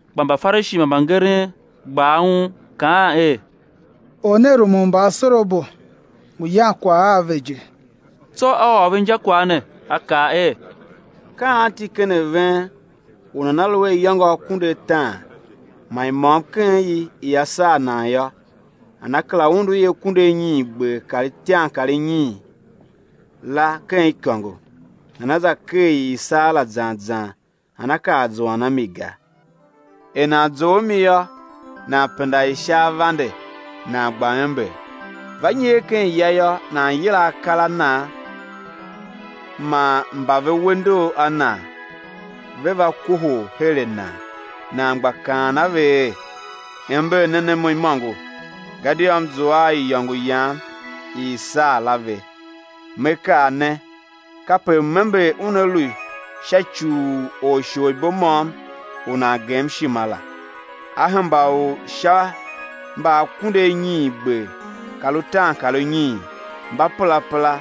Kpa Mbafarishi man mbangeren gba aun kaa er: Or ne rumun mbaasorabo, ngu yan kwagh a ve je. Tsô A ôr ve injakwagh ne, A kaa er: Ka anti ken a ven u nana lu a iyôngo akunduataan man i môm ken i ia saa nan yô, nana kera undu i akunduanyiingber kar itiankarinyiin la ken ikôngo, nana za ker i i saa la zan zan nana kar zuan a mi ga? Er nan zough a mi yô, nan penda i sha avande nan gba ember. Va nyer ken ya yô, nan yila akar a nan man mba ve we ndor a nan, ve̱ va kohol her a nan nan gba kaan a ve er: Ember nen a mo imôngo, gadia m zua a iyôngo yam i i saa la ve! Me kaa ne, kape m-ember una lu Sha sha ci u orsholibo môm u nan gema ishima la, á hemba u sha mba akunduanyiingber kar utaankarunyiin mba perapera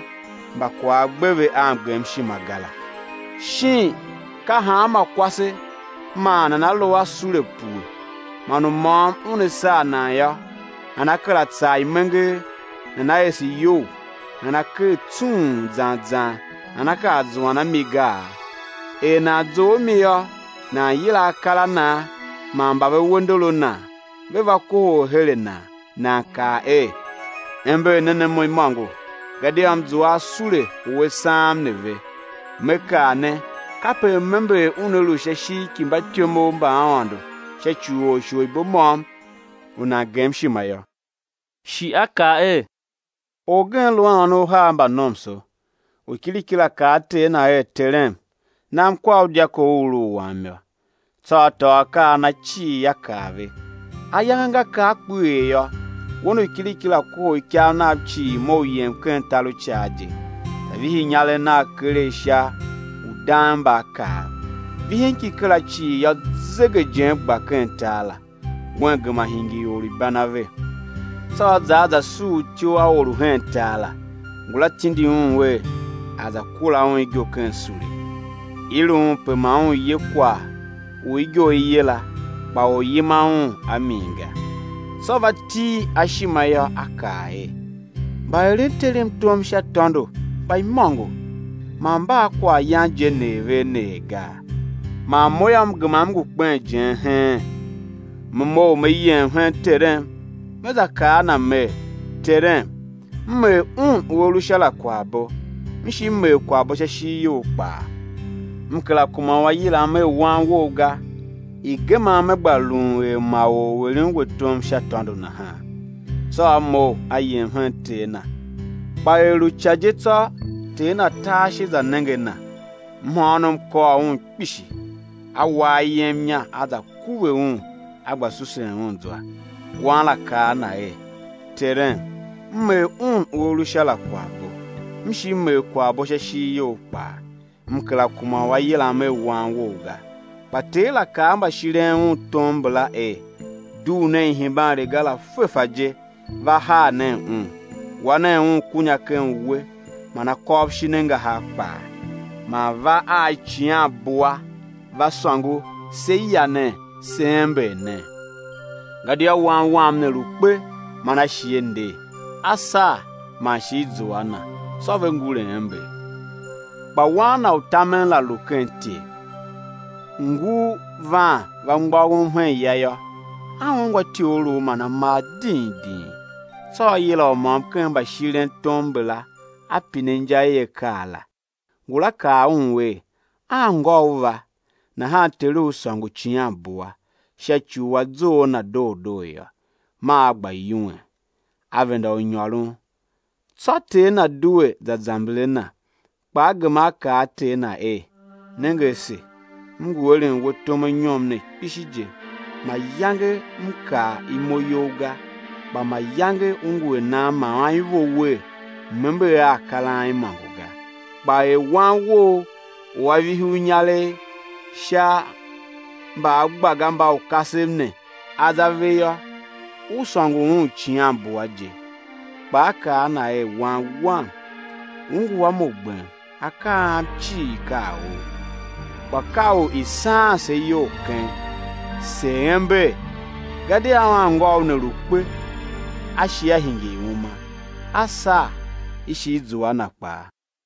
mba kwagh a gbe ve a mgemshima ga la. Shin ka hanma kwase man nana lu a sule pue, man u môm una saa nan yô, nana kera tsar imenger, nana ese iyou, nana ker tsung zan zan nana kar zuan a min gaa? Er nan zough a mi yô, nan yila akar a nan man mba ve we ndor a nan, ve̱ va kohol her a nan, nan kaa er: Ember nen a mo imôngo, gadia m zua a sule u a saam ne ve! Me kaa ne, kape m-ember una lu sha ishigh ki mbatyomov mba Aôndo sha ci u orsholibo môm u nan gem ishima la. Shi A kaa er: Orgen lu a ônov uhar mba nomso. U kiriki la kaa a ter na er: Terem, nam kwar u dyako u u lu u wam yô. Tsô a tôô akaa a na cii a kar ve. Ayange nga kar kpeghee yô, wen u kiriki la kohol ikav nav cii mough yem ken tar u icaa je, za vihi inyaregh nagh keregh sha udangmbaakaav. Vihin ki kera cii yô, zegejen gba ken tar la; wen gema hingir or u ibanave. Tsô a za a za suur ityough a or u hen tar la; ngula tindi un er a̱ za kura un igo ken sule. I lu un pe ma un ye kwagh u igo i ye la, kpa or yima un a min ga. Tsô va til a ishima yô, a kaa er: Mbaeren terem tom sha tôndo mba imôngo man mba a kwaghyan je neer ve a neer gaa, man mo yô, m gema m ngu kpen ijen heen! Me mough me yem hen terem, me za kaa a na mer: Terem m er Un u A lu Sha la kwaghbo m shi m er kwaghbo sha ishigh you kpaa; m kera kuma u á yilam er wan wou ga; i̱ gemam, me gba lun er ma or u eren we tom sha tôndo nahan. Tsô a mough, a yem hen ter na. Kpa er lu ica je tsô, ter na ta ashe, za nenge a na, mhôônom kôr un kpishi, a wa ayem inya, a za kuve un, a gba susen un zwa. Wan la kaa a na er: Terem m er Un u A lu Sha la kwaghbo m shi m er kwaghbo sha ishigh you kpaa; m kera kuma u á yilam er wan wou ga. Kpa ter la kaa a mbashiren un tom mbala er: Dugh nen ihembanriga la fefa je, va haa nen un, wa nen un kunya ken uwe, man akôv shin angahar kpaa; man va a icighangumbua, va sôngo, sé ya nen, sé ember nen; gadia wan wam ne lu kpe man a shi a nder, a saa man shi i zua a na! Tsô ve ngure ember. Kpa wan na u tamen la lu ken ityev; ngur van va mgbôghom hen ya yô, a ungwa ityogholov man amar ding ding. Tsô a yila u môm ken mbashirentom mbala, a pine inja i akaa la. Ngula kaa un er: Anngôu va; nahan teru sôngo icighangumbua, sha ci u a zough a na doo doo yô. Maa a gba yuwen, a venda u nyôron. Tsô ter na due za zamber a na. Kpa a gema a kaa a ter na er: Nenge ase, m ngu eren we tom anyom ne kpishi je, mayange m kar imo you ga, kpa mayange u ngu a nam ma anivo wer, m̱ ember a akar a am imôngo ga. Kpa er wan wou u a vihi u inyaregh sha mbaagbagambaukasev ne, a za ve yô, u sôngo un icighangumbua je. Kpa a kaa a na er: Wan wam, u ngu a mo gbem, akaa a am cii ka a ou. Kpa ka u i̱ saan se iyol keng, se̱ ember, gadia anngôu ne lu kpe, a shi a hingir uma; a saa, i shi i zua a na kpaa.